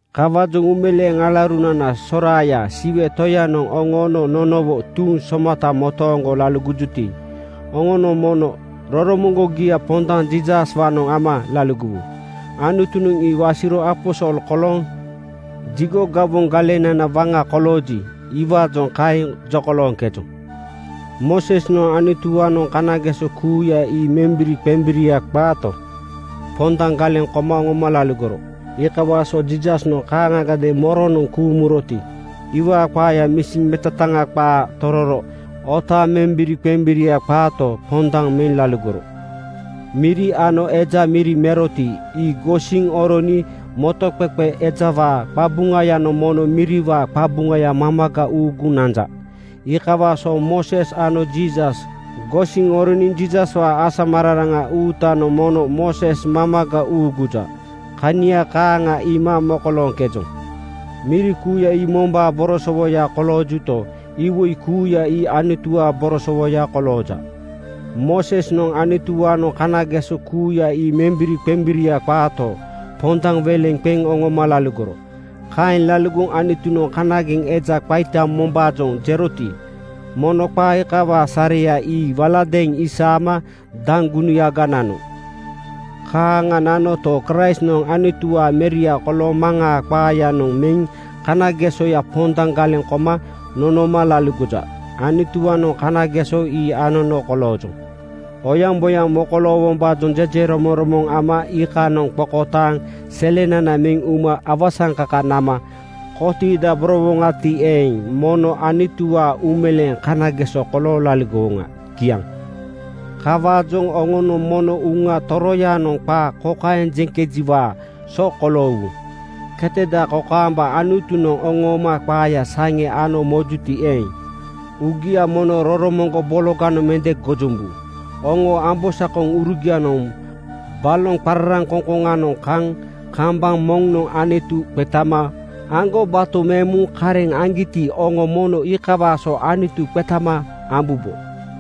Kawaajoŋ uumeleeŋ alaurunana soraaya, Siwe Toyanoŋ oŋoono nonowo tuuŋ somata motooŋgo laligojuti, oŋonoŋ mono uuroromoŋgogia pondaŋ Jiisaswaanoŋ ama laligowu. Anutunoŋ ii wasiro aposol kolooŋ jigo gawoŋ galenana waŋa kolooji, iwaajoŋ kaeŋ jokolooŋkejoŋ. Moosesnoŋ Anutuwaanoŋ kanageso kuuya ii membiriqembiria qaato, pondaŋ galeŋ koma oŋoma laligoro. Iikawaa so Jiisasnoŋ kaaŋagadeeŋ moronoŋ kuuŋ muroti, iwaa qaaya misi metetaŋa qaa tororo otaaŋ membiriqembiria qaato, pondaŋ meŋ laligoro. Miri ano eja miri meroti, ii gosiŋ oroniŋ motoŋqeqe ejawaa qabuŋayanoŋ mono miriwaa qabuŋaya mamaga uuguŋ nanja. Iikawaa so Mooses ano Jiisas gosiŋ oroniŋ Jiisaswaa asamararaŋa uutanoŋ mono Mooses mamaga uuguja. Kania kaaŋa iima mokolooŋkejoŋ. Miri kuuya ii mombaa borosowoya koloojuto, iwoi kuuya ii Anutuwaa borosowoya kolooja. Moosesnoŋ Anutuwaanoŋ kanageso kuuya ii membiriqembiria qaato, pondaŋ weleŋ qeŋ oŋoma laligoro. Kaeŋ laligoŋ Anutunoŋ kanageŋ eja qaita mombaajoŋ jeroti, mono qaa iikawaa sareya ii waladeeŋ isaama daŋgunuyaga nano. Kaaŋa nanoto, Kraistnoŋ Anutuwaa Meria kolooŋ Maŋaa qaaya (misi metetaŋa qaa) noŋ meŋ kanagesoya pondaŋ galeŋ koma nonoma laligoja. Anutuwaanoŋ kanageso ii anono koloojoŋ. Oyaŋboyaŋ mokoloowombaajoŋ jejeromoŋromoŋ ama iikanoŋ qokotaaŋ selenana meŋ uma awasaŋkaka nama kotiidaborowoŋati eeŋ, mono Anutuwaa uumeleeŋ kanageso kolooŋ laligowoŋa. Kiaŋ. Kawaajoŋ oŋonoŋ mono Uŋa Toroyanoŋ qaa kokaeŋ jeŋkejiwaa so koloowu, “Keteda kokaamba Anutunoŋ oŋooma qaaya saŋe ano mojuti eeŋ, uugia mono roromoŋgo bologanoŋ mende gojombu. Oŋoo ambosakoŋurugianoŋ baloŋ qararaŋkoŋkoŋanoŋ kaŋ kambaŋ moŋnoŋ Anutu qetama aŋgobato meŋ muŋ kareŋ aŋgiti, oŋo mono iikawaa so Anutu qetama ambubo.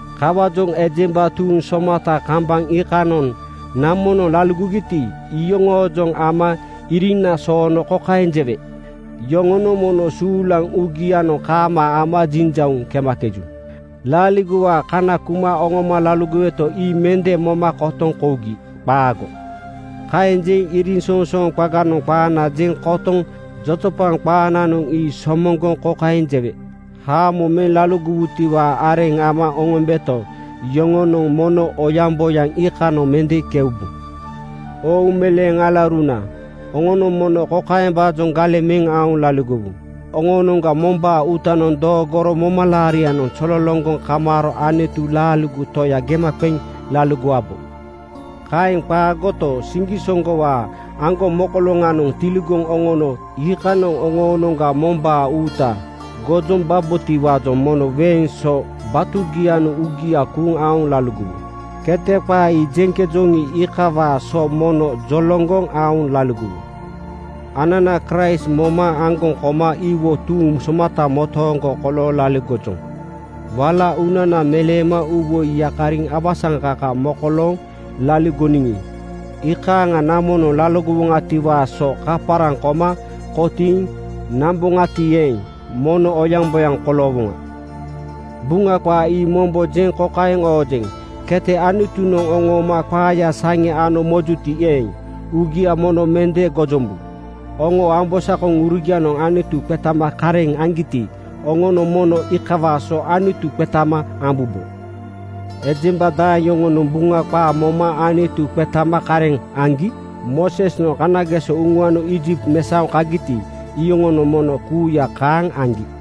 Kawaajoŋ ejemba tuuŋ somata kambaŋ iikanoŋ namonoŋ laligogiti, iyoŋoojoŋ ama iriŋna soono kokaeŋ jewe, ‘Yoŋonoŋ mono suulaŋ uugianoŋ kaamaa ama jinjauŋ kemakeju. Laaligowaa kana kuma oŋoma laligoweto, ii mende moma kotoŋ kougi. Qaago!’ Kaeŋ jeŋ iriŋsoŋsooŋ qaganoŋ qaana jeŋ kotoŋ jojopaŋ qaananoŋ ii somoŋgoŋ kokaeŋ jewe, ‘Haamo meŋ laligowutiwaa areŋ ama oŋombeto, yoŋonoŋ mono oyaŋboyaŋ iikanoŋ mende keubu.’” Oo uumeleeŋ alauruna, oŋonoŋ mono kokaembaajoŋ galeŋ meŋ aoŋ laligowu: Oŋoonoŋga mombaa uutanoŋ doogoro momalaarianoŋ zololoŋgoŋ kamaaro Anutu laaligo Toya gema qeŋ laligowabo. Kaeŋ qaagoto, siŋgisoŋgowaa aŋgomokoloŋanoŋ tiligoŋ oŋono iikanoŋ oŋoonoŋga mombaa uuta gojombabotiwaajoŋ mono weeŋ so batugianoŋ uugia kuuŋ aoŋ laligowu. “Kete” qaa ii jeŋkejoŋi, iikawaa so mono joloŋgoŋ aoŋ laligowu. Anana Kraist moma aŋgoŋ koma iwo tuuŋ somata motooŋgo kolooŋ laligojoŋ. Wala uunana meleema uuwoi yakariŋ awasaŋkaka mokolooŋ laligoniŋi, iikaaŋa namonoŋ laligowoŋatiwaa so kaparaŋ koma kotiiŋ namboŋati eeŋ, mono oyaŋboyaŋ koloowoŋa. Buŋa qaa ii mombo jeŋ kokaeŋ oojeŋ, “Kete Anutunoŋ oŋooma qaaya saŋe ano mojuti eeŋ, uugia mono mende gojombu. Oŋoo ambosakoŋurugianoŋ Anutu qetama kareŋ aŋgiti, oŋonoŋ mono iikawaa so Anutu qetama ambubo.” Ejemba daeŋ yoŋonoŋ Buŋa qaa moma Anutu qetama kareŋ aŋgi? Moosesnoŋ kanageso uŋuano Iijipt mesaoŋ kagiti, iyoŋonoŋ mono kuuya kaaŋ aŋgi.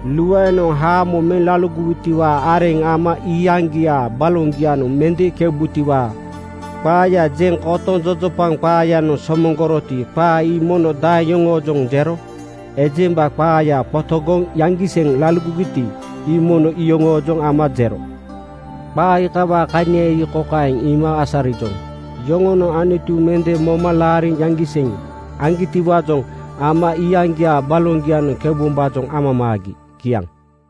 Luaenoŋ haamo meŋ laligowutiwaa areŋ ama iyaŋgiaa baloŋgianoŋ mende keubutiwaa qaaya jeŋ kotoŋ jojopaŋ qaayanoŋ somoŋgoroti, qaa ii mono daeŋ yoŋoojoŋ jero? Ejemba qaaya qotogoŋ yaŋgiseŋ laligogiti, ii mono iyoŋoojoŋ ama jero. Qaa iikawaa kania ii kokaeŋ iima asarijoŋ: Yoŋonoŋ Anutu mende moma laariŋ yaŋgiseŋ aŋgitiwaajoŋ ama iyaŋgiaa baloŋgianoŋ keubombaajoŋ amamaagi. Kiaŋ.